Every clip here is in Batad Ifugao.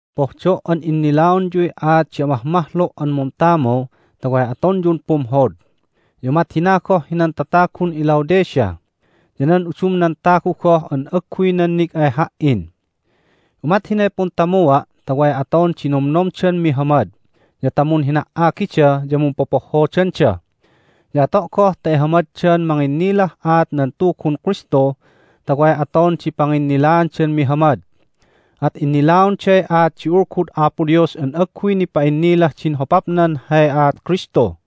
Pohdo' an innilaonyuy aat di amahmahlu' an muntamu ta way atonyun pumhod, ya umat hina goh hinan tatagun iLaodicea, ya nan udumnan tagu goh an agguy nannig ay ha"in. Umat hinay puntamua' ta way aton di nomnomdan mihamad, ya ta munhina"agida ya mumpopohhodanda. Ya ato' goh ta ihamaddan manginnilah aat nan Tugun Kristu ta way aton di panginnilaandan mihamad. At innilaonday aat di Ulgud Apo Dios an agguy nipa'innilah din hopapnan hay aat Kristu.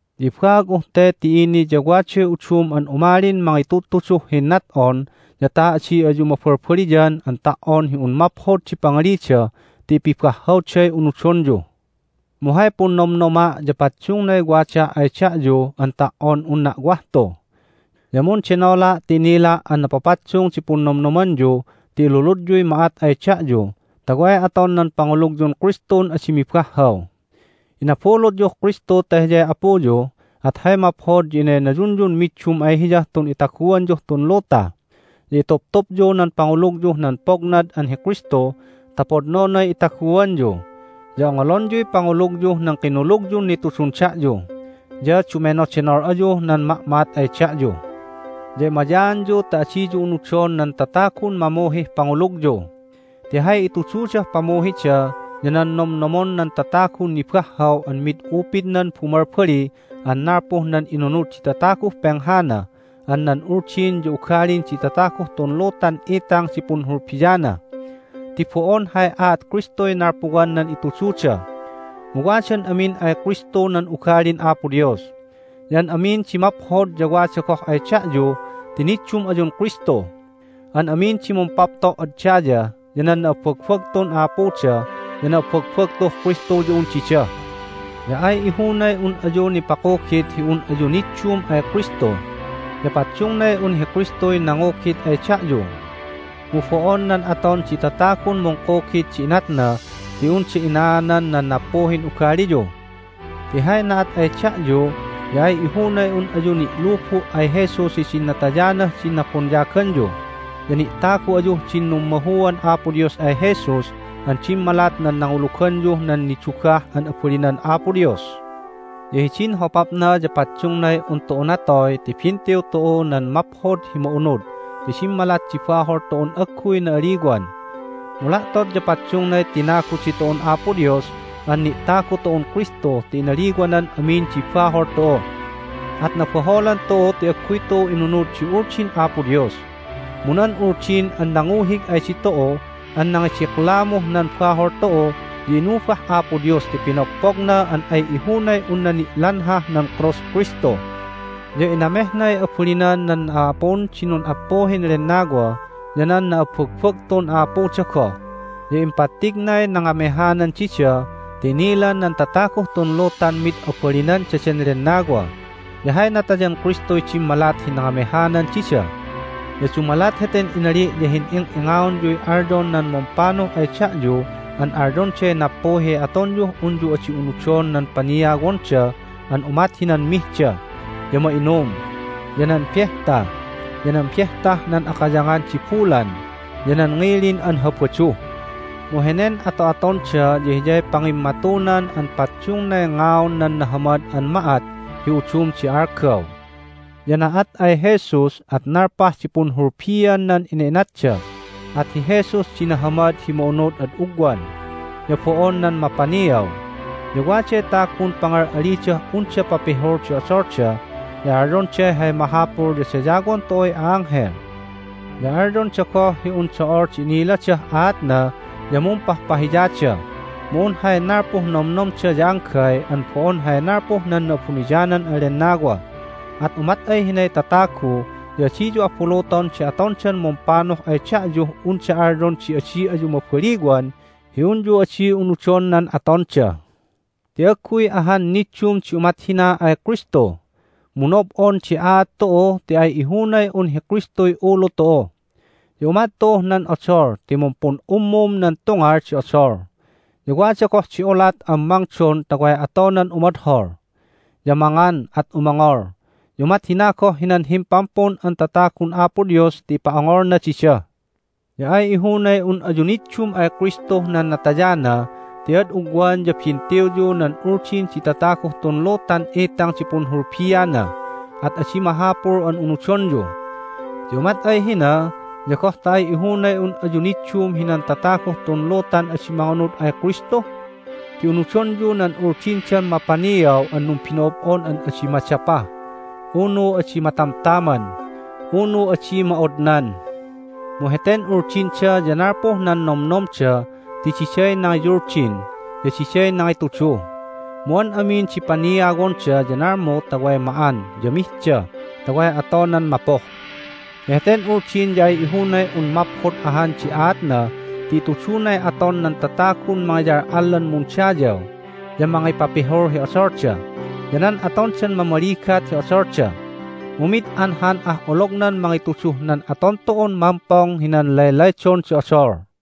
Ya ibaag'uh te ti ini ya waday udum an umalin mangitudtuduh hinnat'on ya ta adi ayu mabalbaliyan an ta"on hi un maphod di pangalida ti ipibahhawday unudonyu! Mu hay punnomnoma' ya paddungnay wadaa' ay da'yu an ta"on unna' wah tu. Ya mundenola' ti inila' an napapaddung di punnomnomanyu ti iluludyuy ma'at ay da'yu ta way aton nan pangulugyun Kristun adi mibahhaw. Inabulutyuh Kristu ta Hiyay Apuyu, at hay maphod ya inaynayunyun middum ay Hiyah tun itaguanyuh tun luta. Ya ituptupyu nan pangulugyuh nan pognad an hi Kristu ta podnonay itaguanyu, ya ongolonyuy pangulugyuh nan kinulugyun nitudun da'yu. Ya dumenodenol ayuh nan ma'ma'at ay da'yu. Ya emayaanyu ta adiyu unudon nan tatagun mamuhih pangulugyu. Ti hay itududah pamuhida ya nan nomnomon nan tatagun nibahhaw an mid upidnan bumalbali an nalpuh nan inunud di tataguh penghana an nan uldin ya ugalin di tataguh tun lutan itang di punhulbiana, ti bo'on hay aat Kristuy nalpuwan nan itududa. Mu wadan amin ay Kristu nan ugalin Apo Dios, ya an amin di maphod ya wada goh ay da'yu ti niddum ayun Kristu. An amin di mumpapto' ad daya ya nan na'abbagbagtun a'apuda ya na'abbagbagtuh Kristu ya un dida. Ya ay ihunay un ayu nipakugit hi un ayu niddum ay Kristu, ya paddungnay un hi Kristuy nangugit ay da'yu. Mu bo'on nan aton di tatagun mungkugit di inatna ti unda inaanan nan nappuhin ugaliyu. Ti hay na'at ay da'yu ya ay ihunay un ayu ni'lubu' ay Jesus hidin natayanah din nabonyaganyu, ya ni'tagu ayuh din nummahuan Apo Dios ay Jesus an dimmalat nan nanguluganyuh nan nidugah an abalinan Apo Dios. Ya hidin hopapna ya paddungnay un tu'u natoy ti bintiw tu'u nan Maphod hi Ma'unud ti dimmalat di bahol tu'un agguy na'aliwan. Mu la'tot ya paddungnay tinagu ditu'un Apo Dios an ni'tagu tu'un Kristu ti inaliwanan amin di bahol tu'u. At nabaholan tu'u ti agguy tu'u inunud di Uldin Apo Dios. Mu nan Uldin an nanguhig ay ditu'u an nangidiklamuh nan bahol tu'u ya inubah Apo Dios ti pinogpogna an ay ihunay unna ni'lanhah nan krus Kristu. Ya inamehnay abalinan nan a'apun di nun'appuhin lennawa ya nan na'abbagbagtun a'apuda goh, ya impattignay nangamehanan dida ti inilan nan tataguh tun lutan mid abalinan daden lennawa, ya hay natayan Kristuy dimmalat hi nangamehanan dida. Ya dumalat heten inali' ya hin'ing'ingaonyuy alyon nan mumpanuh ay da'yu an alyonday nappuhiy atonyuh unyu adi unudon nan paniawonda an umat hinan mihda, ya ma'inum, ya nan behta, ya nan Behtah nan Akayangan di Bulan, ya nan ngilin an Habadu. Mu henen ato'atonda ya hiyay pangimmatunan an paddungnay ngaun nan nahamad an ma'at hi udum di algaw. Ya na'at ay Jesus, at nalpah di punhulbian nan ina'inatda, at hi Jesus di nahamad hi ma'unud ad ugwan, ya bo'on nan mapaniaw. Ya waday tagun pangal'alidah unda papihul di odolda, ya alyonday hay mahapul ya dayawon tu'uy a'anghel. Ya alyonda goh hi un do'ol di iniladah aatna ya mumpahpahiyada, mu un hay nalpuh nomnomda ya anggay an bo'on hay nalpuh nan Na'abuniyanan an Lennawa. At umat ay hinay tatagu ya adiyu abuluton di atondan mumpanuh ay da'yuh unda alyon di adi ayu mabaliwan hi unyu adi unudon nan atonda. Ti agguy ahan niddum di umat hina ay Kristu. Mu nob'on di aat tu'u ti ay ihunay un hi Kristuy ulu tu'u. Ya umat tu'uh nan odol ti mumpun'ummum nan tungal di odol, ya wada goh di ulat an mangdon ta way atonan umodhol. Ya mangan, at umongol, ya umat hina goh hinan Himpampun an Tatagun Apo Dios ti ipa'ongolna dida. Ya ay ihunay un ayu niddum ay Kristuh nan natayana ti ad ugwan ya bintiwyu nan uldin di tataguh tun lutan itang di punhulbiana, at adi mahapul an unudonyu. Ya umat ay hina ya goh ta ay ihunay un ayu niddum hinan tataguh tun lutan adi mangunud ay Kristu? Ti unudonyu nan uldindan mapaniaw an numbino'ob'on an adi madapa, unu adi matamtaman, unu adi ma'odnan. Mu heten uldinda ya nalpuh nan nomnomda ti diday nangiyuldin, ya diday nangitudu. Mu an amin di paniawonda ya nalmu ta way ma'an ya mihda ta way atonan mapuh. Ya heten uldin ya ay ihunay un maphod ahan di aatna ti itudunay aton nan tatagun mangiyal'allan mundayaw, ya mangipapihul hi odolda, ya nan atondan mamaligat hi odolda. Mu mid anhan ah olognan mangituduh nan aton tu'un mampong hinan laylaydon di odol!